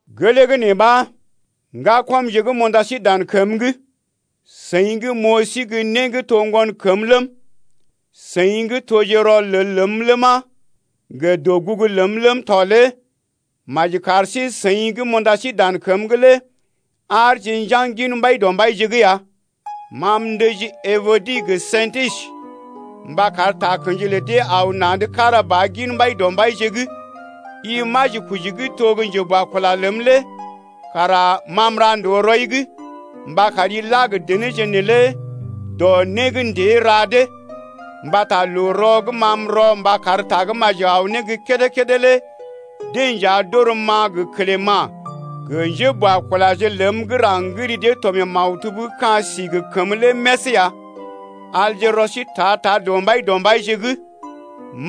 Gelee gə́ nee ɓa, ŋgakɔmje gə́ m’unda sí dan kəm’g, seḭ gə́ m’oo sí gə́ né gə́ to gə́ ŋgonkəm ləm, seḭ gə́ toje rɔlel ləm ləma, gə dɔgugu ləm ləm tɔ lé maji kar sí-seḭ gə́ m’unda sí dan kəm’g lé aarje njaŋg gin Mbaidɔmbaije’g ya. Ma m’ndəji Ebodi gə Sḭtisə mba kar takə̰ji lə dee aw na̰’d kára ba gin Mbaidɔmbaije’g. I majikoji gə́ to gə́ njeboakula ləm lé kara ma m’ra ndòo rɔi’g mba kari la gə denéje neelé dɔ né gə́ ndée ra dee, mbata loo-rɔ gə́ ma m’rɔ mba kar Tagə́maji aw ne gə́ kédé-kédé lé deḛ nja d’orəm-ma gə Klema̰ gə njéboakulaje ləm gə́ raŋg gə́ ri dee to mee maktub gə́ ka̰ sí gə kəmə lé més ya. Alje rɔ sí ta-ta gin Mbaidɔmbaije’g.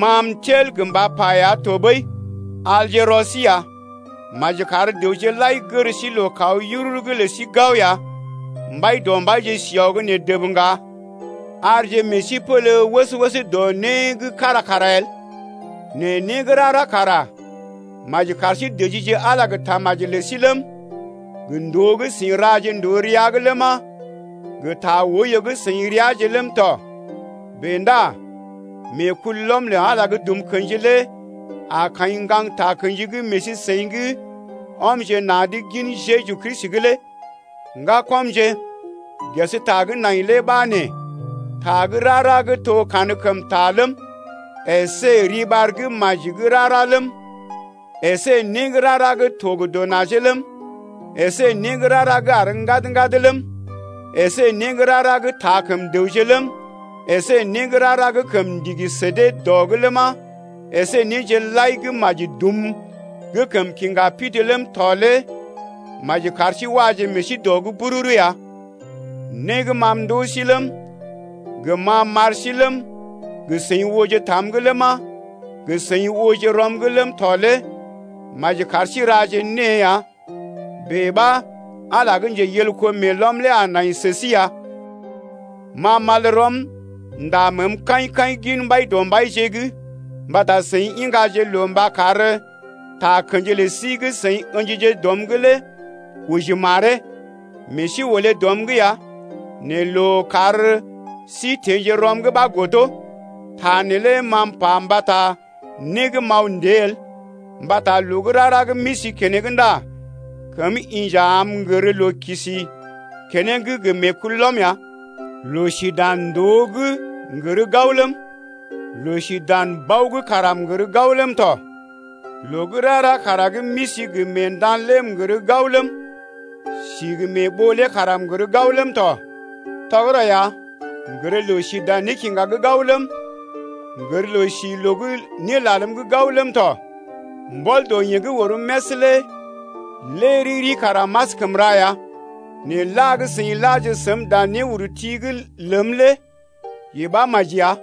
Ma m’tel gə mba pa ya tɔɓəi, alje rɔ sí ya. Maji kar dəwje lai gər sí loo kaw yururu’g lə sí gao ya. Mbaidɔmbaije si aw gə́ nee dəb ŋga. Arje meḛ sí pélé wəs-wəs dɔ né gə́ kára kara el, nɛ né gə́ rara kara maji kar sí dəjije Ala gə tamaji lə sí ləm, gə ndòo gə́ seḭ raje ndòo rəa’g ləma, gə ta oiyo gə́ seḭ reaje ləm tɔ. Bèe ndá meekulɔm lə Ala gə́ dum kḛji lé a kaḭ ŋgaŋ takə̰ji gə́ meḛ sí-seḭ gə́ ɔmje na̰’d gin Jeju Kristi lé. Ŋgakɔmje, ges ta gə́ nai lé ɓa nee: Ta gə́ rara gə́ to gə́ kankəmta ləm, əsé riɓar gə́ maji gə́ rara ləm, əsé né gə́ rara gə́ to gə dɔ najee ləm, əsé né gə́ rara gə́ àr ŋgad-ŋgad ləm, əsé né gə́ rara gə́ taa kəm dəwje ləm, əsé né gə́ rara gə́ kəm ndigi sə dee dɔ’g ləma, əsé néje lai gə́ maji dum gə́ kəm kiŋga pidi ləm tɔ lé maji kar sí waje meḛ sí dɔ’g bururu ya. Né gə́ ma m’ndoo sí ləm, gə́ ma m’ar sí ləm, gə́ seḭ ooje tam’g ləma, gə́ seḭ ooje rɔm’g ləm tɔ lé maji kar sí raje née ya. Bèe ɓa Ala gə́ njeyelko meelɔm lé a nai sə sí ya. Ma m’al rɔm m’ndá məəm kaḭ-kaḭ gin Mbaidɔmbaije’g mbata seḭ iŋgaje loo mba kar takə̰ji lə sí gə́ seḭ ə̰jije dɔm’g lé oji maree. Meḛ sí olé dɔm’g ya nɛ loo kar sí teḛ ne rɔm’g ɓa godo. Ta neelé ma m’pa mbata né gə́ m’aw ndée el mbata loo gə́ rara gə́ m’isi keneŋ ndá kəm inja am m’gər loo kisi keneŋ gə meekulɔm ya. Loo si dan ndòo’g m’gər gao ləm, loo si dan bao’g kara m’gər gao ləm tɔ. Loo gə́ rara kara gə́ m’isi gə mée ndan lé m’gər gao ləm, si gə mée ɓoo lé kara m’gər gao ləm tɔ. Tɔgərɔ ya, m’gər loo si dan nékiŋga’g gao ləm, m’gər loo si loo gə́ né lalm’g gao ləm tɔ. Mbɔl dɔ yeḛ gə́ orəm més lé lé riri kara m’askəm ra ya. Nɛ la gə́ seḭ laje səm dan néurti’g ləm lé yee ɓa maji ya.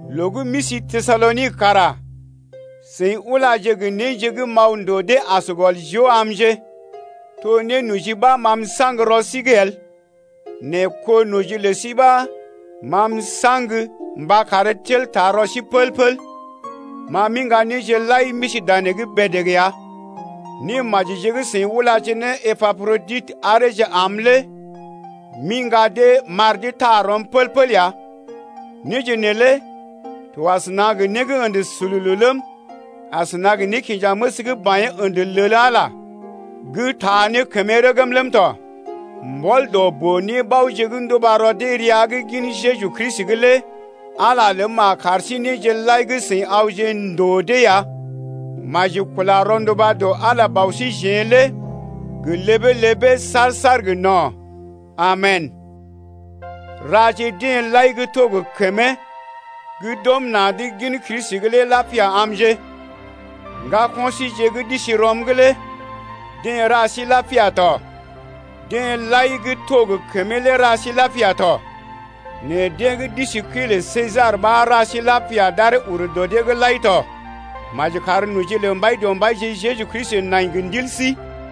Loo gə́ m’isi Tesalonik kara seḭ ulaje gə néje gə́ m’aw ndòo dee as gɔl joo amje. To nénoji ɓa ma m’saŋg rɔ sí’g el, nɛ kó noji lə sí ɓa ma m’saŋg mba karee tel taa rɔ sí pəl-pəl. Ma m’iŋga néje lai m’isi danee bèdèg ya. Némajije gə́ seḭ ulaje ne Epaproditə areeje am lé m’iŋga dee m’ar dee taa rɔm pəl-pəl ya. Néje neelé to asəna gə né gə́ ə̰də sululu ləm, asəna gə nékinjaməs gə́ baḭyee ə̰də lel Ala lé gə́ taa ne kəmee rəgm tɔ. Mbɔl dɔ boo-nébaoje gə́ nduba rɔ dee rəa’g gin Jeju Kristi’g lé Ala ləm a kar sí néje lai gə́ seḭ awje ndòo dee ya. Maji kula rɔnduba dɔ Ala Bɔ síjeḛ lé gə ləbee-ləbee saar-saar gə no̰. Amen! Raje deḛ lai gə́ to gə kəmee gə́ d’ɔm na̰’d gin Kristi lé lapia amje. Ŋgako̰ síje gə́ d’isi rɔm’g lé deḛ ra sí lapia tɔ. Deḛ lai gə́ to gə kəmee lé ra sí lapia tɔ, nɛ deḛ gə́ d’isi kəi lə Sesar ɓa ra sí lapia d’aree ur dɔ dee’g lai ya. Maji kar noji lə Mbaidɔmbaije Jeju Kristi nai gə ndil sí.